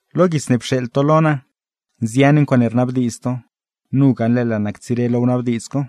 Lo guits ne pxeeḻ to lo naa, nzian ncuaaṉe rnabdiidz to, nu gaṉle laa naa ctsire lo wnabdiidz co: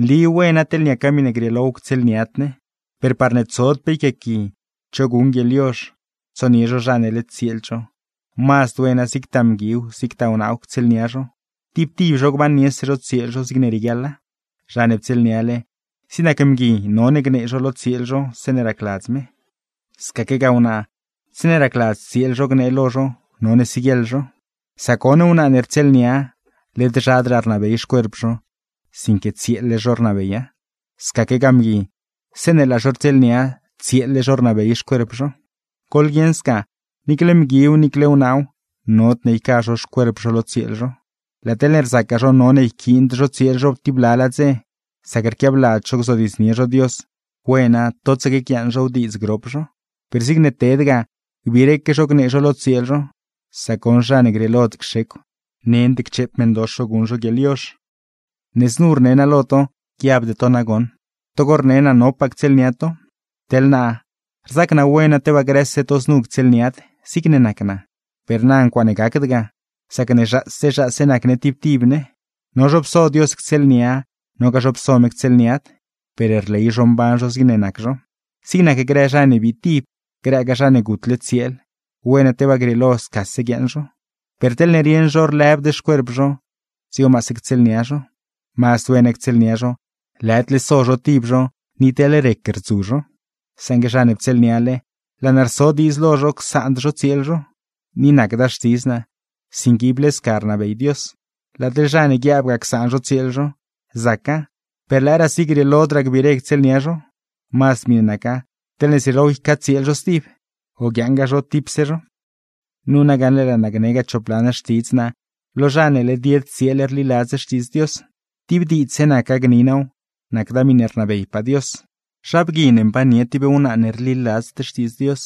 nli wena, teḻne niaca miṉe grieelow ctsieelniad ne. Per parne tsod pe yquiaaqui cho guṉ guieḻyozh, tsonie zho zha ne led tsieeld zho, mazd wena zigtaa mguiw, zigtaa wnaaw ctsieelnia zho, tib tib zho gbanniese zho tsieel zho zigne rieguiaḻa. Zha ne ptsieelniale, zig nac mgui none gnee zho lo tsieel zho zeeṉe racladz me, scaquegaa wnaa zeeṉe racladz tsieel zho gnee lo zho none siguieḻ zho. Sac goṉ wnaa ne rtsieelnia, led zhadraa rnabey xcuerp zho, sinque tsieel-le zho rnabeya; scaquegaa mgui zeeṉe laa zho rtsieelnia, tsieel-le zho rnabey xcuerp zho. Goḻguieṉ sca, niicle mguiw niicle wnaaw nodne yca zho xcuerp zho lo tsieel zho. Laa teḻne rzacgaa zho none yquiind zho tsieel zho tib blalaa dze, sac rquiabladz zho gzodiidznie zho Dios, wena totsaque guiaaṉ zhow diidz grop zho. Per zigne ted ga, gbiireque gnee zho lo tsieel zho, sac goṉ zha ne grieelod cxecw, nend ccheep meṉdox zho guṉ zho guieḻyozh. Ne znu rne naa lo to, guiabde to nagoṉ togo rne naa nopaa ctsieelnia to. Teḻ naa, rzac naa wena tebaa grëse to znu ctsieelniad, zigne nac naa; per na ncuaaṉe gacd ga, sacne zhaase zhaase nac ne tib tib ne. No zho pso Dios ctsieelnia, nogaa zho pso me ctsieelniad, per rley zho mban zho zigne nac zho. Zig nac grë zha ne bii tib, grëgaa zha ne gutle tsieel, wena tebaa grieelo scase guiaaṉ zho, per teḻne rieṉ zho lëbd xcuerp zho, dzigo mazd ctsieelnia zho. Mazd wena ctsieelnia zho, lëdle so zho tib zho ni teḻ rec rdzu zho. Saṉgue zha ne ptsieelniale, laa naa rso diidz lo zho csaand zho tsieel zho, ni nacda xtidz naa, sinque ible sca rnabey Dios. Laa teḻ zha ne guiaabgaa csaan zho tsieel zho, zaca, per lëëraasi grieelodraa gbiire ctsieelnia zho, mazd miṉe naca teḻne zrieelow ycatsieel zho stib, o guiaaṉgaa zho tipse zho. Nu na gaṉle laa naa gnegaa chop lan xtidz naa lo zha ne led yed tsieel rliladz Xtiidz Dios; tib diidzse naca gni naaw, nacda miṉe rnabeypaa Dios. Zha bgui ne mbannie tib wnaa ne rliladzd Xtiidz Dios,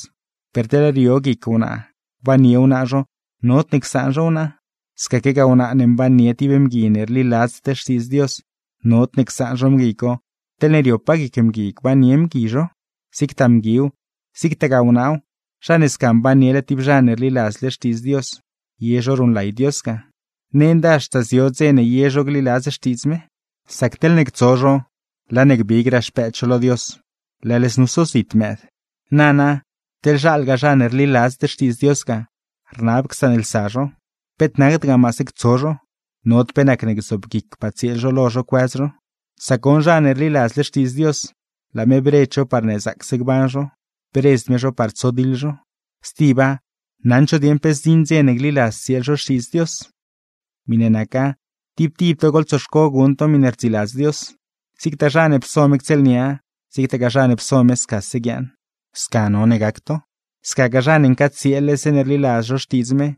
per teḻne rio guic wnaa gbannie wnaa zho, nodne csaan zho wnaa. Scaquegaa wnaa ne mbannie tib mgui ne rliladzd Xtiidz Dios, nod csaan zho mgui co teḻne riopaa guic mgui gbannie mgui zho. Zigtaa mguiw, zigtagaa wnaaw, zha ne sca mbannie tib zha ne rliladzle xtiidz Dios, ye zho ruṉlay Dios ga, nenda haxta zio dze ne ye zho gliladz xtiidz me. Sac teḻne ctso zho, laa ne gbigraa xpëëd zho lo Dios, leḻ znu sozit mëëd. Nana, teḻne zhalgaa zha ne rliladzd Xtiidz Dios ga, rnab csaanlsa zho, peet nacda maase ctso zho, nod pe nacne gzoobguicpaa tsieel zho lo zho cuëz zho. Sac goṉ zha ne rliladzle Xtiidz Dios, laa me bredz zho parne zaacse gban zho, bredzd me zho par tsodiḻ zho; stiba, naṉd zho dieṉ pe zdziṉ dze ne gliladz tsieel zho Xtiidz Dios. Miṉe naca tib tib to goḻtsoxco guṉ to miṉe rdziladz Dios. Zigtaa zha ne pso me ctsieelnia, zigtagaa zha ne pso me scase guiaaṉ, sca none gac to; scagaa zha ne ncaatsieel-le zeeṉe rliladz zho xtiidz me,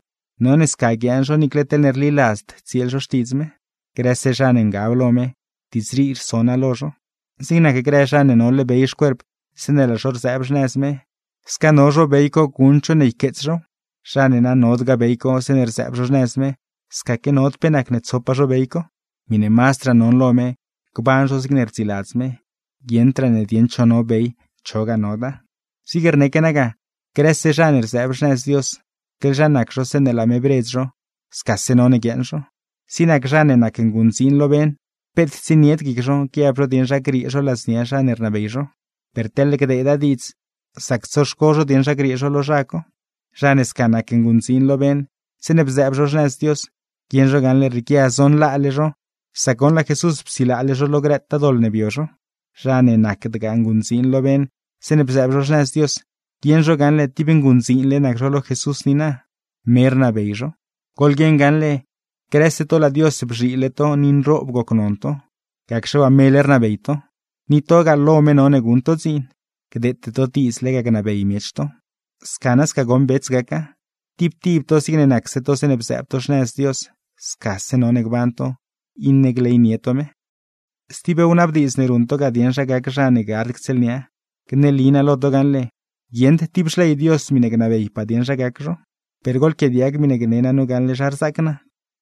none sca guiaaṉ zho niicle teḻne rliladzd tsieel zho xtiidz me. Grëse zha ne ngab lo me, diidz rii rso naa lo zho. Zig nac grë zha ne nole bey xcuerp zeeṉe laa zho rzëëb xnëz me, sca no zho bey co guṉd zho ne yqueets zhow. Zha ne na nodgaa bey co zeeṉe rzëëb zho xnëz me, scaque nod pe nacne tsopaa zho bey co. Miṉe mazdraa non lo me, gban zho zigne rdziladz me, guieṉdraa ne dieṉ cho no bey, chogaa noda. Zigne rneque naa ga, grëse zha ne rzëëb xnëz Dios, teḻ zha nac zho zeeṉe laa me bredz zho, scase none guiaaṉ zho. Zig nac zha ne nac nguṉdziin lo beṉ, peet tsienied guic zho guiab zho dieṉ zha griee zho ladznia zha ne rnabey zho; per teḻne gdeeda diidz, zac tsoxco zho dieṉ zha griee zho lo zha co. Zha ne sca nac nguṉdziin lo beṉ zeeṉe bzëëb zho xnëz Dios, guieṉ zho gaṉle rrieequia zonlaale zho, sac goṉ laa Jesús psilaale zho lo grëtaa doḻ ne bio zho. Zha ne nacdgaa nguṉdziin lo beṉ zeeṉe bzëëb zho xnëz Dios, guieṉ zho gaṉle tib nguṉdziinle nac zho lo Jesús niina, me rnabey zho. Goḻguieṉ gaṉle, grëse to laa Dios bzhiile to ni nroob gocnon to, gacxe waa mele rnabey to; ni togaa, lo me none guṉ to dziin, gdeete to diidz lega gnabey miech to. Sca nasca goṉ bets gaca, tib tib to zigne nacse to zeeṉe bzëëb to xnëz Dios scase no gban to, iṉe gleynie to me. Stib wnabdiidz ne ruṉ to ga dieṉ zha gac zha ne gard ctsieelnia, gneli naa lo to gaṉle, guieṉd tib xley Dios miṉe gnabeypaa dieṉ zha gac zho. Per goḻquiaadiag miṉe gne naa nu gaṉle zha rzaac naa,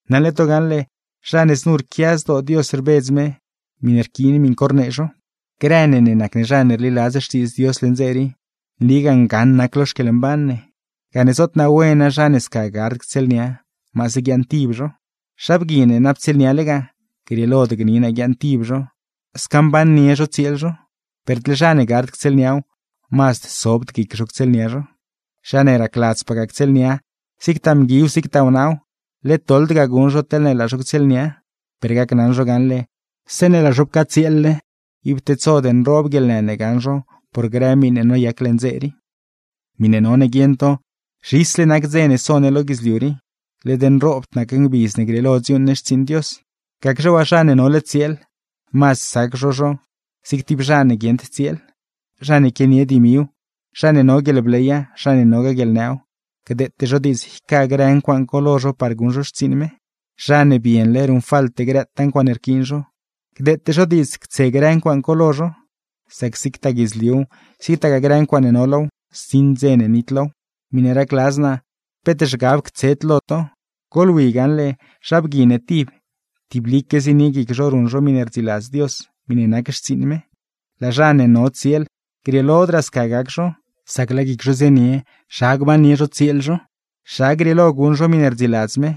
naṉle to gaṉle, zha ne znu rquia zdoo Dios rbedz me, miṉe rquiin miṉ co rnee zho. Grë ne ne nac ne zha ne rliladz Xtiidz Dios leṉ dze rii, nligaa ngaṉ nac lo xquieḻmban ne, gane zoot naa wena zha ne sca gard ctsieelnia, maase guiaaṉtib zho. Zha bgui ne na ptsieelnialegaa, grieelod gni naa guiaaṉtib zho; sca mbannie zho tsieel zho; per teḻ zha ne gard ctsieelniaw, mazd sobd guic zho ctsieelnia zho. Zha ne racladzpagaa ctsieelnia, zigtaa mguiw zigtaa wnaaw, led doḻd ga guṉ zho teḻne laa zho ctsieelnia; per gacnaṉ zho gaṉle, zeeṉe laa zho pcatsieel-le, ib tedsod nroob guieḻnë ne gaṉ zho por grë miṉe noyac leṉ dze rii. Miṉe none guieṉ to: zhisle nac dze ne so ne lo guidzliu rii, led nroob nac ngbidz ne grieelo dziuuṉ ne xtsiiṉ Dios; gacxe waa, zha ne nole tsieel, mazd sac zho zho zig tib zha ne guieṉd tsieel. Zha ne quianie dimiw, zha ne no guieḻbleya, zha ne nogaa guieḻnëw, gdeete zho diidz yca grë ncuaaṉ co lo zho par guṉ zho xtsiiṉ me. Zha ne bienle ruṉfalte grëtaa ncuaaṉe rquiin zho, gdeete zho diidz ctse grë ncuaaṉ co lo zho, sac zigtaa guidzliuw, zigtaa grë ncuaaṉe no low, zdziṉ dze ne nitlow. Miṉe racladz naa peet zhgab ctsed lo to. Goḻwi gaṉle, zha bgui ne tib, tiblique zienie guic zho ruṉ zho miṉe rdziladz Dios, miṉe nac xtsiiṉ me. Laa zha ne no tsieel, grieelodraa sca gac zho, sac laa guic zho zienie zha gbannie zho tsieel zho, zha grieelo guṉ zho miṉe rdziladz me,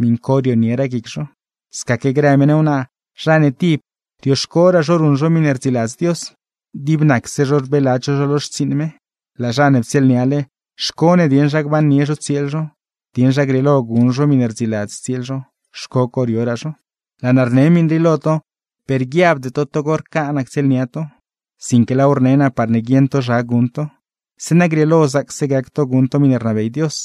miṉ co rionieraa guic zho. Scaque grë meṉ wnaa, zha ne tib, rioxcoraa zho ruṉ zho miṉe rdziladz Dios, dib nacse zho rbeeladz zho zho lo xtsiiṉ me. Laa zha ne ptsieelniale, xco ne dieṉ zha gbannie zho tsieel zho, dieṉ zha grieelo guṉ zho miṉe rdziladz tsieel zho, xco co rioraa zho. Laa naa rne miṉ rii lo to, per guiabde to togo rca naa ctsieelnia to, sinque laaw rne naa parne guieṉ to zha guṉ to, zeeṉa grieelo zaacse gac to guṉ to miṉe rnabey Dios.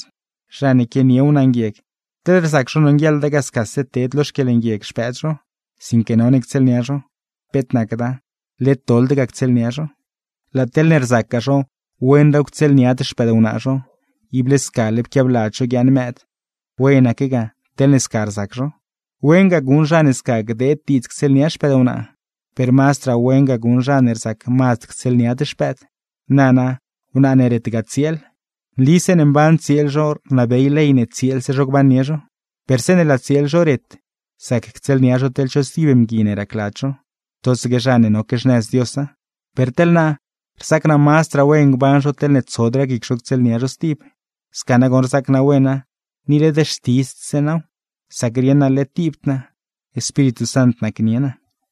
Zha ne quianie wnaa nguieg, teḻne rzac zho nonguieḻda ga scase ted lo xquieḻnguieg xpëëd zho, sinque none ctsieelnia zho, peet nacda, led doḻd ga ctsieelnia zho. Laa teḻne rzacgaa zho, wenraaw ctsieelniad xpëdwnaa zho, ible scale pquiabladz zho guiaaṉ mëëd, wenaque ga teḻne sca rzac zho. Wen ga guṉ zha ne sca gdeed diidz ctsieelnia xpëdwnaa, per mazdraa wen ga guṉ zha ne rzac mazd ctsieelniad xpëëd. Nana, wnaa ne retgaa tsieel, nli zeeṉe mban tsieel zho rnabey ley ne tsieelse zho gbannie zho; per zeeṉe laa tsieel zho ret, zac ctsieelnia zho teḻ cho stib mgui ne racladz zho, totsaque zha ne noque xnëz Diosa. Per teḻ naa, rzac naa mazdraa wen gban zho teḻne tsodraa guic zho ctsieelnia zho stib; sca nagoṉ rzaac naa wena, ni led xtiidzdse naaw sac rieṉ naa led tibd naa, Espíritu Sant nacnie naa.